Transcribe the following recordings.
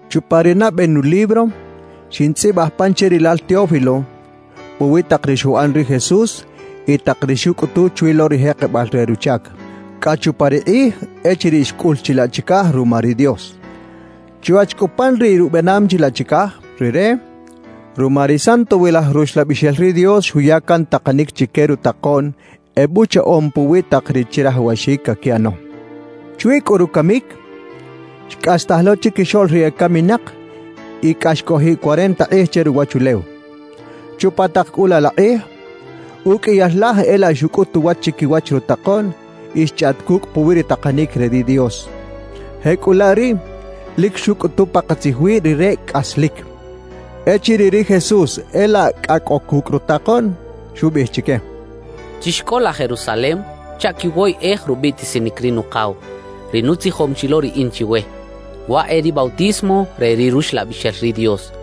Chupa ri nabe nulibro, xintzꞌibaj pan che rilal Teófilo, puwi tak ri xuꞌan ri Jesús y tak ri xucꞌutu chwi lo ri jekebal re ruchac cꞌa chupa ri kꞌij echiriꞌ xcꞌul chilaꞌ chicaj ruma ri Dios. Chwach cꞌu pan riꞌ rubenam chilaꞌ chicaj, Rire ruma ri Santowilaj Ruxlabixel ri Dios xuya can takanic chique rutakoꞌn ebuchaꞌom puwi tak ri chirajawaxic caquiꞌano. Chwi cꞌu rucamic, xcꞌastaj lo chiquixoꞌl ri ecaminak y cꞌa xcꞌojiꞌ cuarenta kꞌij che ruwachulew. Chupa tak cꞌu laꞌ la kꞌij, uqꞌuiyal laj e laꞌ xucꞌut uwach chiquiwach rutakoꞌn y xchꞌaꞌt cucꞌ puwi ri takanic re ri Dios. Jecꞌulaꞌ riꞌ, lic xucꞌutu pakatzij wi Rire cꞌaslic. Echiriꞌ ri Jesús e laꞌ cꞌa cꞌo cucꞌ rutakoꞌn, xubiꞌij chique: —Chixcꞌola Jerusalem chaꞌ quiwoyꞌej rubiꞌtisinic ri Nukaw, ri nutzijom chi lo riꞌin chiwe; waꞌ e ri bautismo re ri Ruxlabixel ri Dios.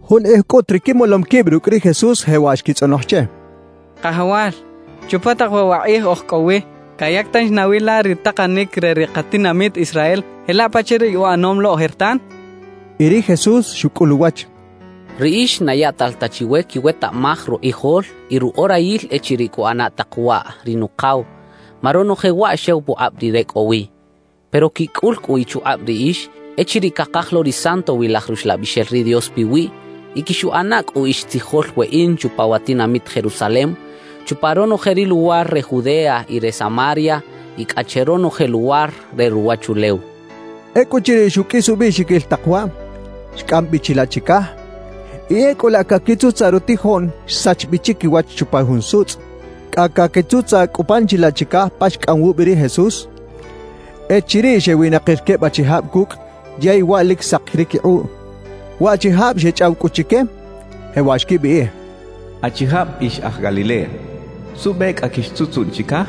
Jun kꞌij cꞌut ri quimolom quib rucꞌ ri Jesús jewaꞌ xquitzꞌonoj che: —Kajawal, ¿chupa tak waꞌ wa kꞌij oj cꞌo wi, cayac tanchi nawi la ri takanic re ri katinamit Israel jelaꞌ pachaꞌ ri uꞌanom lo ojertan? —xechaꞌ. Y ri Jesús xucꞌul uwach: —Riꞌix na yaꞌtal ta chiwe quiwetaꞌmaj rukꞌijol y ruꞌorayil echiriꞌ cuꞌana tak waꞌ ri Nukaw, ma ronoje waꞌ xew pukꞌab Rire cꞌo wi. Pero quicꞌul cꞌu ichukꞌab riꞌix echiriꞌ cakaj lo ri Santowilaj Ruxlabixel ri Dios piwiꞌ y quixuꞌana cꞌu ix tzijol weꞌin chupa wa tinamit Jerusalem, chupa ronoje ri luwar re Judea y re Samaria y cꞌa che ronoje luwar re ruwachulew —xcha chique. Ecꞌuchiriꞌ xuqꞌuis ubiꞌxiquil tak waꞌ, xcꞌam bi chilaꞌ chicaj; y ecꞌu laꞌ caquitzutzaꞌ rutijoꞌn xsach bi chiquiwach chupa jun sutzꞌ. Cꞌa caquitzutzaꞌ cꞌu pan chilaꞌ chicaj pa xcꞌam wubi ri Jesús, echiriꞌ xewinakir queb achijab cucꞌ yey waꞌ lic sak ri quikꞌuꞌ. Waꞌchijab xechꞌaw cꞌu chique, jewaꞌ xquibiꞌij: —Achijab ix aj Galilea, ¿suꞌbe cꞌa quixtzutzuꞌn chicaj?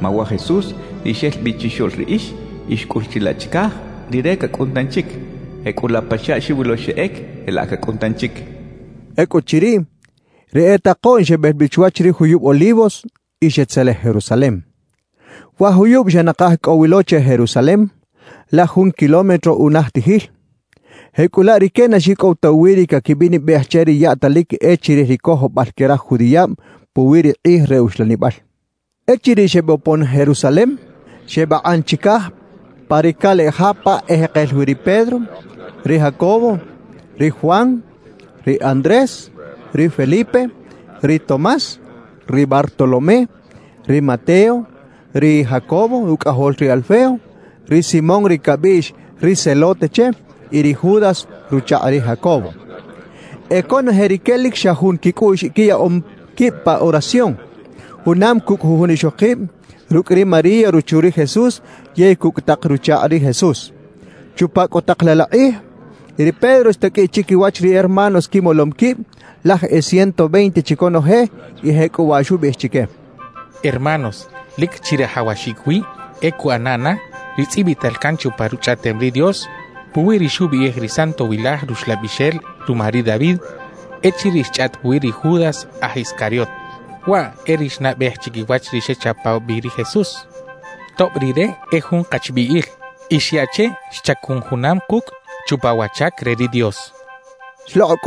Ma wa Jesús, ri xel bi chixoꞌl riꞌix y xcꞌul chilaꞌ chicaj, Rire cacꞌun tanchic. Jecꞌulaꞌ pachaꞌ xiwilo xeꞌec, jelaꞌ cacꞌun tanchic —xecha chique. Ecꞌuchiriꞌ, ri e takoꞌn xebel bi chwach ri juyub Olivos y xetzelej Jerusalem. (Wa juyub xa nakaj cꞌo wi lo che Jerusalem, laj jun kilómetro unajtijil; jecꞌulaꞌ rique na xicꞌow ta uwiꞌ ri caquibinibej che ri yaꞌtalic e chirij ri cojobal que raj judiꞌab puwi ri kꞌij re uxlanibal.) Echiriꞌ xebopon Jerusalem, xebakꞌan chicaj pa ri caleꞌ ja pa ejekel wi ri Pedro, ri Jacobo, ri Juan, ri Andrés, ri Felipe, ri Tomás, ri Bartolomé, ri Mateo, ri Jacobo rucꞌajol ri Alfeo; ri Simón ri cabiꞌx “ri Zelote” che y ri Judas ruchakꞌ ri Jacobo. E conoje rique lic xa jun quicꞌuꞌx quiyaꞌom quib pa oración, junam cucꞌ jujun ixokib, rucꞌ ri María ruchu ri Jesús yey cucꞌ tak ruchakꞌ ri Jesús. Chupa cꞌu tak laꞌ la kꞌij, ri Pedro xtaqꞌuiꞌ chiquiwach ri hermanos quimolom quib, laj e ciento veinte chi conoje, y jecꞌuwaꞌ xubiꞌij chique: «Hermanos, lic chirajawaxic wi e cuꞌana na ri tzꞌibital can chupa Ruchꞌaꞌtem ri Dios puwi ri xubiꞌij ri Santowilaj Ruxlabixel ruma ri David echiriꞌ xchꞌaꞌt puwi ri Judas aj Iscariot. Waꞌ e ri xnabej chiquiwach ri xechapaw bi ri Jesús, tob rire e jun kachbiꞌil y xyaꞌ che xchacun junam kucꞌ chupa wa chac re ri Dios» xchaꞌ.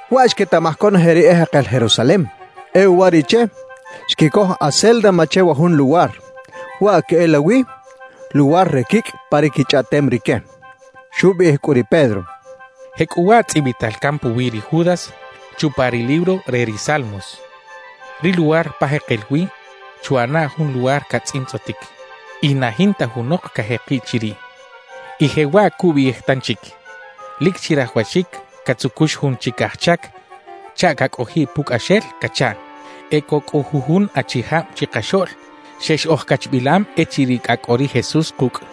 Waꞌ xquetaꞌmaj conoje ri ejekel Jerusalem. E uwariꞌche, xquicoj “Acéldama” che wa jun luwar; waꞌ queꞌelawi “Luwar re Quicꞌ” pa ri quichꞌaꞌtem rique.) Xubiꞌij cꞌu ri Pedro: «Jecꞌuwaꞌ tzꞌibital can puwi ri Judas chupa ri libro re ri Salmos: Ri luwar pa jekel wi chuꞌana jun luwar catzꞌintzꞌotic, y na jinta junok cajekiꞌ chiriꞌ. Y jewaꞌ cubiꞌij tanchic: Lic chirajawaxic catzucux jun chic aj chac chaꞌ cacꞌojiꞌ pucꞌaxel cachaꞌ. »E cꞌo cꞌu jujun achijab chikaxoꞌl xex ojcachbilam echiriꞌ cꞌa cꞌo ri Jesús kucꞌ,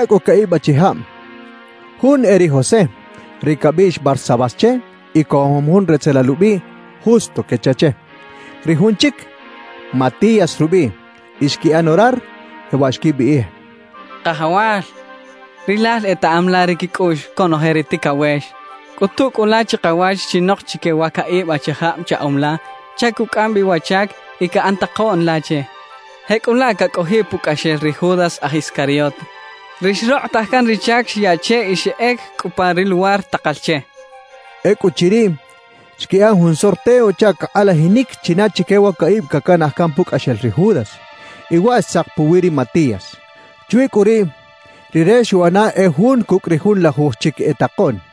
Xequichaꞌ cꞌu caꞌib achijab. Jun e ri José, ri cabiꞌx Barsabás che y cojom jun retzelal ubiꞌ “Justo” quecha che. Ri jun chic, Matías rubiꞌ. Y xquiꞌan orar, jewaꞌ xquibiꞌij: «Kajawal, Rilal etaꞌam la ri quicꞌuꞌx conoje ri ticawex. Cꞌutu cꞌu la chikawach chinok chique wa caꞌib achijab chaꞌom la chaꞌ cucꞌam bi wa chac y caꞌan takoꞌn la che; jecꞌulaꞌ cacꞌojiꞌ pucꞌaxel ri Judas aj Iscariot, ri xrokꞌotaj can ri chac xyaꞌ che y xeꞌec cꞌu pa ri luwar takal che» xechaꞌ. Ecꞌuchiriꞌ, xquiꞌan jun sorteo chaꞌ cakꞌalajinic china chique wa caꞌib cacanaj can pucꞌaxel ri Judas; y waꞌ xtzak puwi ri Matías. Chwi cꞌu riꞌ, rire xuꞌana e jun cucꞌ ri junlajuj chic e takoꞌn.